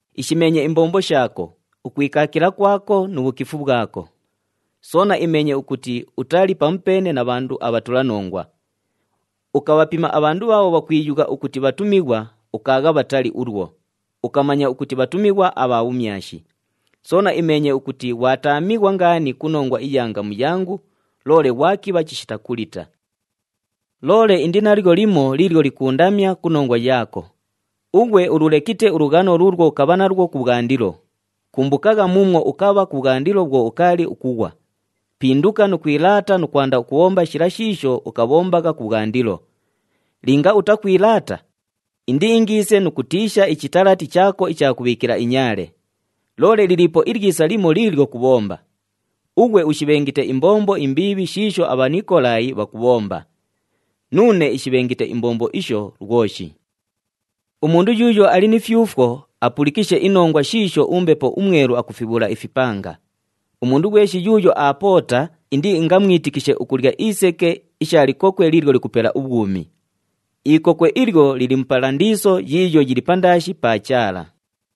Ishimeenye imbombo shaako, ukwikaakila kwako nu bhukifu bhwako. Soona imeenye ukuti utali pamupeene na bhandu abhatulanongwa. Ukabhapima abhandu bhaabho bhakwiyugha ukuti bhatumighwa, ukaagha bhatali ulwo, ukamanya ukuti bhatumighwa abha bhumyashi. Soona imeenye ukuti ghwataamighwa ngaani ku nongwa iya ngamu yangu, loole ghwakibha chishita kulita. Loole indi nalyo limo liilyo likuundamya ku nongwa yaako. Ughwe ululekite ulughano luulwo ukabha nalwo kubhwandilo. Kumbukagha muumwo ukabha kubhwandilo bhwo ukaali ukughwa. Pinduka nu kwilaata nu kwanda ukubhomba shila shiisho ukabhombagha kubhwandilo. Linga utakwilaata, indiingiise nu kutiisha ichitalati chaako icha kubhiikila inyaale. Loole liliipo ilyisa limo liilyo kubhomba. Ughwe ushibhengite imbombo imbiibhi shiisho aBhanikolaayi bhakubhomba. Nuune ishibhengite imbombo isho lwoshi. Umundu yuuyo ali ni fyufwo, apulikishe inongwa shiisho uMbepo uMwelu akufibhuula ifipanga. Umundu ghweshi yuuyo aapoota, indiingamwitikishe ukulya iseke isha likokwe liilyo likupela ubhwumi. Ikokwe ilyo lili mu Palandiiso yiiyo yili pandaashi pa Chaala.”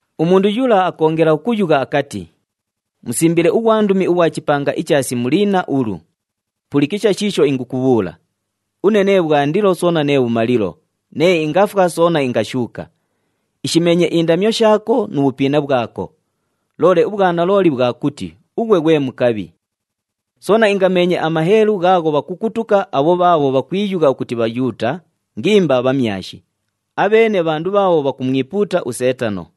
Umundu yula akoongela ukuyugha akati, “Musimbile ughwandumi ughwa chipanga icha Simuliina ulu: Pulikisha shiisho ingukubhuula! Une nee Bhwandilo soona nee Bhumalilo, nee ingafwa soona ingashuuka. Ishimeenye indamyo shaako nu bhupiina bhwako. Loole ubhwanalooli bhwa kuti, ughwe ghwe mukabhi! Soona ingameenye amaheelu ghaagho bhakukutuka abho bhaabho bhakwiyugha ukuti Bhayuuta, ngimba bhamyashi, abheene bhandu bhaabho bhakumwipuuta uSeetano.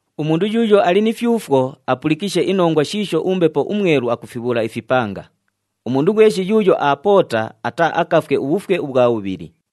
Umundu yuuyo ali ni fyufwo, apulikishe inongwa shiisho uMbepo uMwelu akufibhuula ifipanga. Umundu ghweshi yuuyo aapoota, ataaakafwe ubhufwe ubhwa bhubhili.”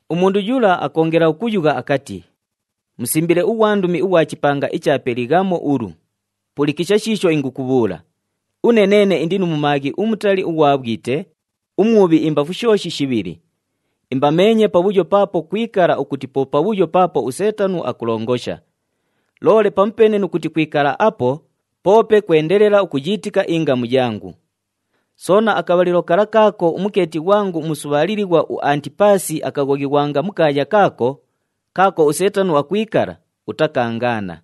Umundu yula akoongela ukuyugha akati, “Musimbile ughwandumi ughwa chipanga icha Pelighamo ulu: Pulikisha shiisho ingukubhuula! Une neene indi nu mumaaghi umutali ughwa bhwite, umwubhi imbafu shooshi shibhili. Imbameenye pabhuyo paapo kwikala ukuti po pabhuyo paapo uSeetano akulongosha. Loole pamupeene nu kuti kwikala apo, poope kwendelela ukuyiitika ingamu yangu. Soona akabhalilo kala kaako umukeeti ghwangu umusubhaalilighwa uAntipaasi akaghoghighwanga mu kaaya kaako, kaako uSeetano akwikala, utakaangaana.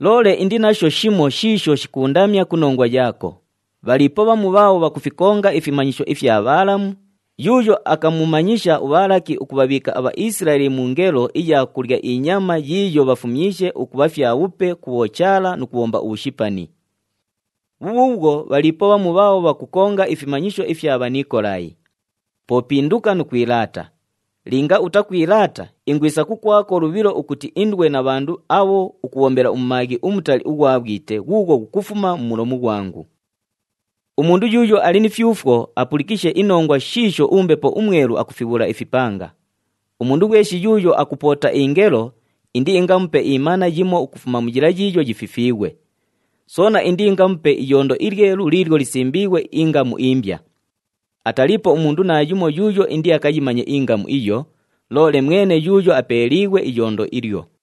Loole indi nasho shimo shiisho shikuundamya ku nongwa yaako. Bhaliipo bhamu bhaabho bhakufikonga ifimanyisho ifya Bhaalamu, yuuyo akamumanyisha uBhaalaki ukubhabhiika aBhaisilaeli mu ngelo iya kulya inyama yiiyo bhafumyishe ukubha fyabhupe ku bhochaala nu kubhomba ubhushipani. Bhubhuubhwo, bhaliipo bhamu bhaabho bhakukonga ifimanyisho ifya Bhanikolaayi. Po pinduka nu kwilaata! Linga utakwilaata, ingwisa kukwako lubhilo ukuti indwe na bhandu abho ukubhombela mumaaghi umutali ughwa bhwite ghuughwo ghukufuma mu mulomu ghwangu. Umundu yuuyo ali ni fyufwo, apulikishe inongwa shiisho uMbepo uMwelu akufibhuula ifipanga. Umundu ghweshi yuuyo akupoota ingelo, indiingamupe imana yimo ukufuma mu yila yiiyo yififiighwe. Soona indiingamupe iyondo ilyelu liilyo lisimbiighwe ingamu imbya. Ataliipo umundu naayumo yuuyo indiakayimanye ingamu iyo, loole mwene yuuyo apeeliighwe iyondo ilyo.”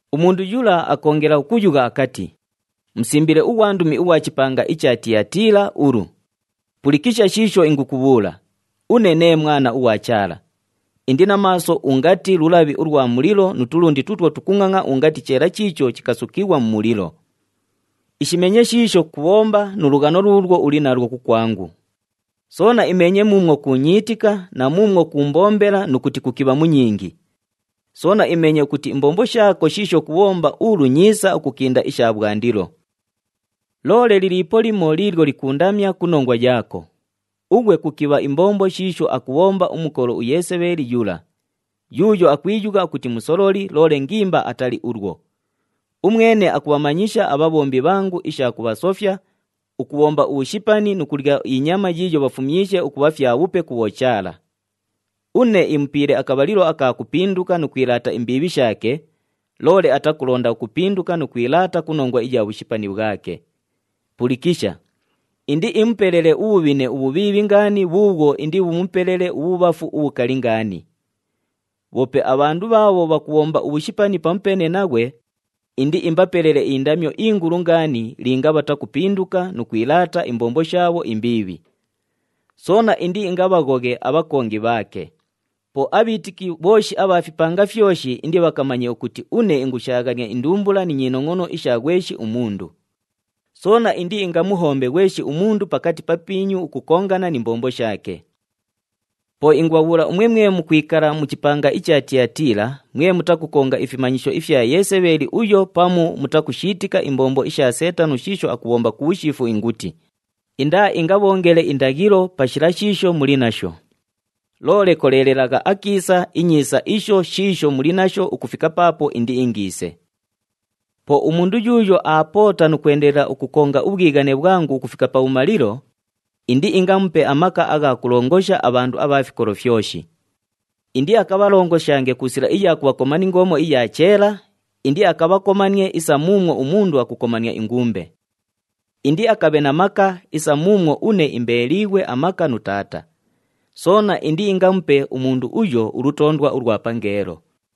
Umundu yula akoongela ukuyugha akati, “Musimbile ughwandumi ughwa chipanga icha Tiyatiila ulu: Pulikisha shiisho ingukubhuula! Une nee Mwana ughwa Chaala. Indi na maaso ungati lulabhi ulwa mulilo nu tulundi tuutwo tukungʼangʼa ungati cheela chiicho chikasukighwa mu mulilo. Ishimeenye shiisho kubhomba nu lughano luulwo uli nalwo kukwangu. Soona imeenye muumwo kuunyiitika na muumwo kuumbombela nu kuti kukibha mu nyingi. Soona imeenye ukuti imbombo shaako shiisho kubhomba ulu nyiisa ukukinda isha bhwandilo. Loole liliipo limo liilyo likuundamya ku nongwa yaako. Ughwe kukibha imbombo shiisho akubhomba umukolo uYesebheeli yula, yuuyo akwiyugha ukuti musololi, loole ngimba atali ulwo. Umwene akubhamanyisha abhabhombi bhangu isha kubhasofya, ukubhomba ubhushipani nu kulya inyama yiiyo bhafumyishe ukubha fyabhupe ku bhochaala. Une imupiile akabhalilo aka kupinduka nu kwilaata imbiibhi shaake, loole atakulonda ukupinduka nu kwilaata ku nongwa iya bhushipani bhwake. Pulikisha! Indiimupelele ubhubhine ubhubhiibhi ngaani bhuubhwo indibhumupelele ubhubhafu ubhukali ngaani. Bhoope abhandu bhaabho bhakubhomba ubhushipani pamupeene naghwe, indiimbapelele indamyo ingulu ngaani linga bhatakupinduka nu kwilaata imbombo shaabho imbiibhi. Soona indiingabhaghoghe abhakongi bhaake. Po abhiitiki bhooshi abha fipanga fyoshi indibhakamanye ukuti une ingushaaghania indumbula ni nyinongʼono isha ghweshi umundu. Soona indiingamuhombe ghweshi umundu pakati papiinyu ukukongana ni mbombo shaake. Po ingubhabhuula umwe mwe mukwikala mu chipanga icha Tiyatiila, mwe mutakukonga ifimanyisho ifya Yesebheeli uyo pamu mutakushiitika imbombo isha Seetano shiisho akubhomba ku bhushiifu inguti, indaaingabhoongele indaghilo pa shila shiisho muli nasho. Loole koleelelagha akiisa inyiisa isho shiisho muli nasho ukufika paapo indiingiise. Po umundu yuuyo aapoota nu kwendelela ukukonga ubhwighane bhwangu ukufika pabhumalilo, ‘Indiingamupe amaka agha kulongosha abhandu abha fikolo fyoshi. Indiakabhalongoshange ku sila iya kubhakoma ni ngoomo iya cheela, indiakabhakomanie isa muumwo umundu akukomania ingumbe.’ Indiakabhe na maka, isa muumwo une imbeeliighwe amaka nu Taata. Soona indiingamupe umundu uyo, ulutoondwa ulwa pangeelo.